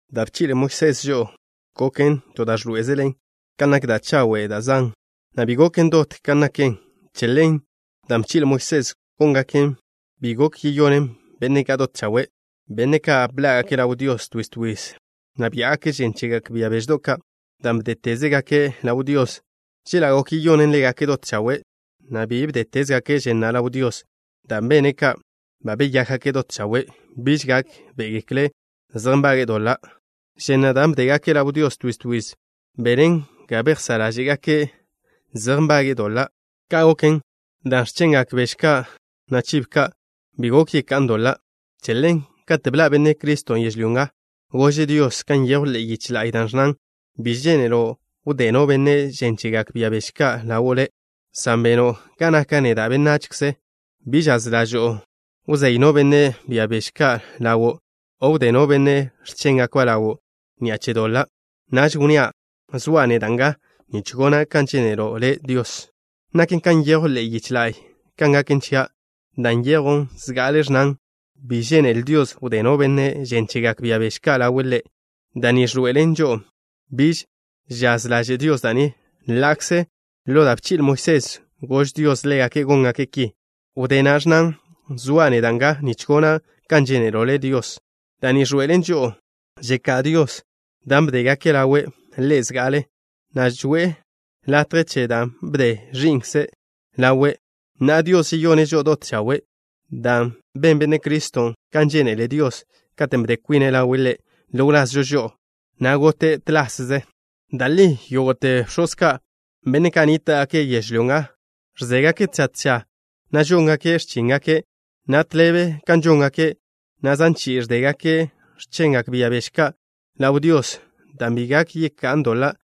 Da' bchi'le Moisés žo'o goken to da' ẕḻoé'ezelen kan nak da' chawe' da' zan', na' bi goken dot kan naken. Che ḻen, dan' bchi'le Moisés góngake' bi gok yeyonen benne' ka' dot chawe', benne' ka' bḻá'gake' ḻaw Dios twiz twiz, na' biá'gake' žen chegak bia beždo' ka', dan' bdétezegaken' ḻaw Dios. Chela' gok yeyonen ḻégake' dot chawe', na' bi bdétezgake' žen na' ḻaw Dios, dan' benne' ka' ba beyákgake' dot chawe' biž gákbe'egekle' zej nbage'e doḻa'. Žen na' da' bdégake' ḻaw Dios twiz twiz benen ga bejsá' ḻáže'gake' zej nbage'e doḻa'. Ka' goken dan' x̱chengak beže ka', na' chibo ka', bi gok yeká'an doḻa'. Che ḻen, kate' bḻa' Benne' Criston' yežlyó nga, gože' Dios kan nyejw ḻe'e yiche la'y, da' ẕnnan: Bi žénelo' wdé no benne' žen chegak bia beže ka' ḻawo' Le', san beno' ga naka' neda' benachze. Bi žaz ḻažo'o wzéy no benne' bia beže ka' ḻawo', o wdé no benne' x̱chéngakba' ḻawo' ni'a che doḻa'. Naž wnnía': “Zoa' neda' nga nich gona' kan žénelo' Le', Dios. Naken kan nyejw ḻe'e yiche la'y kan gaken chia'.” Dan' nyejw zga'ale ẕnnan: “Bi žénele Dios wdé no benne' žen chegak bia beže ka' ḻawe' Ḻe'.” Da' ni ẕḻoe'elen žo'o biž žaz ḻaže' Dios da' ni, ḻa'kze ḻo da' bchi'le Moisés gož Dios ḻégake' góngake' ki. Wdé na' ẕnnan: “Zoa' neda' nga nich gona' kan žénelo' Le', Dios.” Da' ni ẕḻoe'elen žo'o žeká' Dios dan' bdégake' ḻawe' Ḻe' zga'ale, na' ẕzoe' latje chen da' bde Ẕi'nkze' ḻawe'. Na'a, Dios žeyone' žo'o dot chawe' dan' ben Benne' Criston' kan žénele Dios katen' bde kwine' ḻawe' Ḻe' ḻo wlazžo žo'o, na' gote' toze chi'i. Da' li yógo'te bx̱oz ka', benne' ka' nníta'gake' yežlyó nga, ẕzégake' tža tža, na' žóngake' x̱chíngake', na' tḻebe kan žóngake', na' zan chi'i ẕdégake' x̱chengak bia beže ka' ḻaw Dios, dan' bi gak yeká'an doḻa'.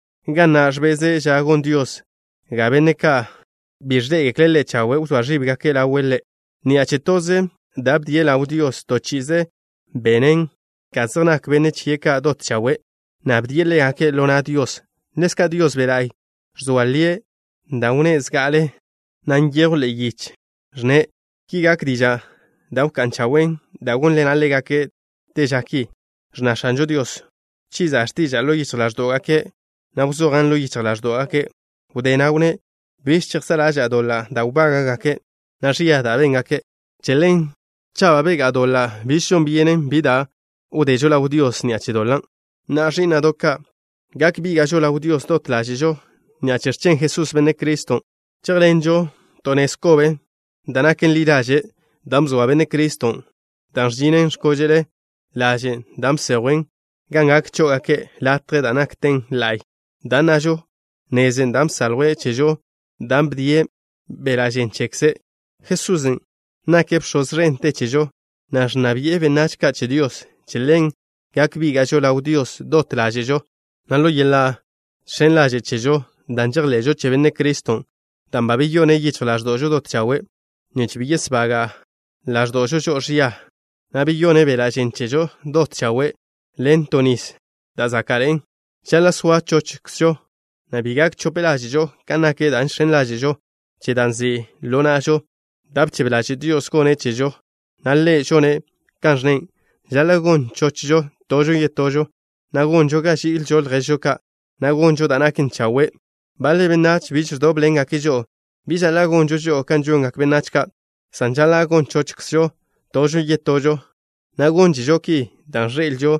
ga na' ẕbeze' ža gon Dios ga benne' ka' bi ẕḻé'egekle' Ḻe' chawe' wzóa ẕíbgake' ḻawe' Ḻe'. Ni'a che toze da' bdie' ḻaw Dios, to chi'ize bene' ga zej nak benne' chie' ka' dot chawe', na' bdie' ḻégake' ḻo na' Dios. Ḻezka' Dios Be' La'y ẕzoa lie' da' wnné' zga'ale, na' nyejwn ḻe'e yiche, ẕnne': Ki gak dižan' da' wká'n chawen' da' gónḻena' ḻégake' Te ža ki. Ẕnna X̱anžo Dios: “Wchiza' x̱tiža'a ḻo yichj ḻáẕdo'gake', na' wzojan' ḻo yichj ḻáẕdo'gake'.” Wdé na' wnné': Biž chejsá' ḻaža'a doḻa' da' wbága'gake', na' ẕia da' béngake'. Che ḻen, cha' ba begá'a doḻa', biž žon byenen bi da' wdežo ḻaw Dios ni'a che doḻa'. Na'a, ẕí'na'do' ka', gak bíga'žo ḻaw Dios dot ḻáže'žo ni'a che x̱chen Jesús, Benne' Criston'. Chéjḻenžo to nez kobe, da' naken ḻi ḻaže', dan' bzoa Benne' Criston', dan' ẕžinen x̱kóže'le ḻažen' da' bsejwen gan gak chó'ogake' latjen' da' nakten la'y, dan' nnažo, nezen' dan' bsaljwe' chežo dan' bdie' beḻa' žen chekze'. Jesusen' nake' Bx̱oz ẕente chežo, na' ẕnna bi'e benách ka' che Dios. Che ḻen gak bíga'žo ḻaw Dios dot ḻáže'žo, na' ḻo yeḻa' žx̱en ḻaže' chežo, dan' žejḻe'žo che Benne' Criston', dan' ba beyone' yichj ḻáẕdo'žo dot chawe', nich bi yesbaga' ḻáẕdo'žo žo'o ẕia, na' beyone' beḻa' žen chežo dot chawe' ḻen to nis da' záka'ḻe'en. Žaḻa' soa chochžo, na' bi gak chope ḻáže'žo kan nak da' žx̱en ḻáže'žo che da' nzi' ḻo na'žo, da' bchebe ḻaže' Dios gonne' chežo, na' Ḻe' žone' kan ẕnne'. Žaḻa' gon chochžo tožo yetožo, na' gonžo ga ži'ilžo lježžo ka', na' gonžo da' naken chawe'. Baḻe benách biž ẕdóbḻengake' žo'o. Bi žaḻa' gonžo žo'o kan žongak benách ka', san žaḻa' gon chochžo tožo yetožo, na' gónžežo ki dan' ẕḻe'elžo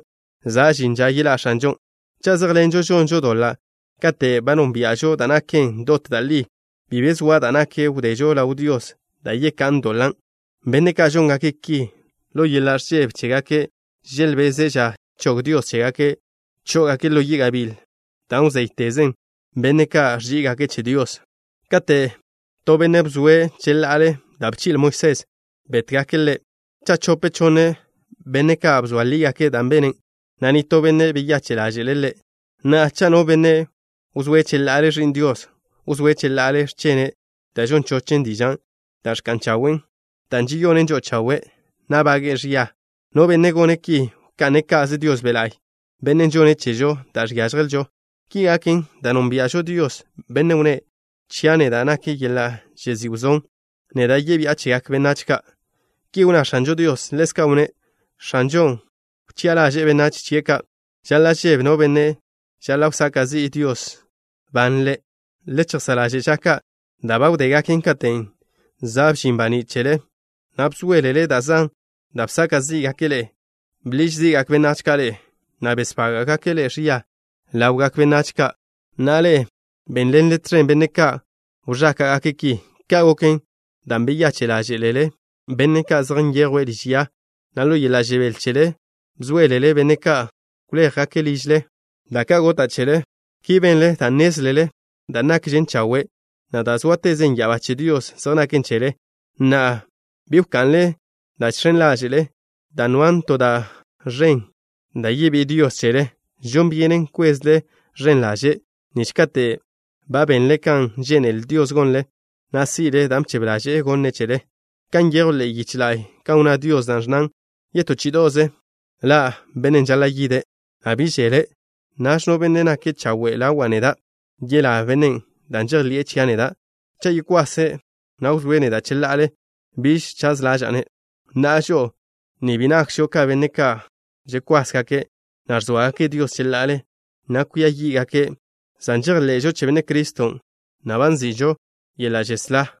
za' žin ža yeḻá' X̱anžon'. Cha' zéjḻenžo žonžo doḻa' kate' ba nónbia'žo da' naken dot da' li, bi be zoa da' gak wdežo ḻaw Dios da' yeká'an doḻan'. Benne' ka' žóngake' ki, ḻo yeḻa' ẕžebe chégake' želbeze' ža chog Dios chégake' chó'ogake' ḻo yi' gabíl, dan' wzéytezen benne' ka' ẕží'igake' che Dios. Kate' to benne' bzoe' cheḻa'ale da' bchi'le Moisés, bétgake' ḻe' cha' chope chonne benne' ka' bzoa lígake' da' bene', na' nitó benne' beyache' ḻáže'le' ḻe'. Na'a, cha' no benne' wzóe' cheḻa'ale Ẕi'n Dios, wzóe' cheḻa'ale x̱chene' da' žon chochen dižan' da' ẕka'n chawen', dan' žeyonen žo'o chawe', na' bága'že' ẕia. No benne' gone' ki wka'ne' ka'ze Dios Be' La'y, Bennen' žonne' chežo da' žiážjelžo. Ki gaken dan' nónbia'žo Dios, Bennen' wnné': “Chia' neda' nak yeḻa' žezí' wzón. Neda' yebi'a chegak benách ka'.” Ki wnná X̱anžo Dios. Ḻezka' wnné': “X̱anžon' wchi'a ḻaže'e benách chie' ka'.” Žaḻa' žebe no benne' žaḻa' wsaka' zi'i Dios ban ḻe'. Le chejsá' ḻaže' ža ka' da' ba wdégaken katen' za' bžin baní' chele, na' bzóelele da' zan da' bsaka' zí'gake' ḻe'e. Bḻiž zí'gak benách ka' ḻe'e, na' besbága'gake' ḻe'e ẕia ḻawgak benách ka', na' ḻe'e bénḻenle tẕen benne' ka' wẕáka'gake' ki. Ka' goken dan' beyache' ḻáže'lele benne' ka' zej nyejwe' liž ya, na' ḻo yeḻa' žebél chele bzóelele benne' ka' wléjgake' ližle da' ka' gota' chele. Ki benle dan' nnézlele da' nakžen chawe', na' da' zóatezen ya'abá che Dios zej naken chele. Na'a, bi wka'nle dan' žx̱en ḻáže'le, dan' noan to da' ẕen da' yebí'i Dios chele. Žon byenen kwezle ẕen ḻaže', nich kate' ba benle kan žénele Dios gonle, na' si'le da' bchebe ḻaže'e gonne' chele, kan nyejw ḻe'e yiche la'y, kan wnná Dios, da' ẕnnan: Yetó chí'ido'ze ḻa' Bennen' žaḻa' yide', na' bi žeḻe'. Naž no benne' nake' chawe' ḻawa' neda', yelá bennen' dan' žejḻi'e chia' neda'. Cha' yekwase', na' wzóe' neda' cheḻa'ale, biž chaz ḻaža'a-ne'. Na'a, žo'o ni bi nakžo ka benne' ka' ẕkwásgake', na' ẕzóagake' Dios cheḻa'ale, na' kwia yí'gake', san žejḻe'žo che Benne' Criston', na' ba nzi'žo yeḻa' žeslá.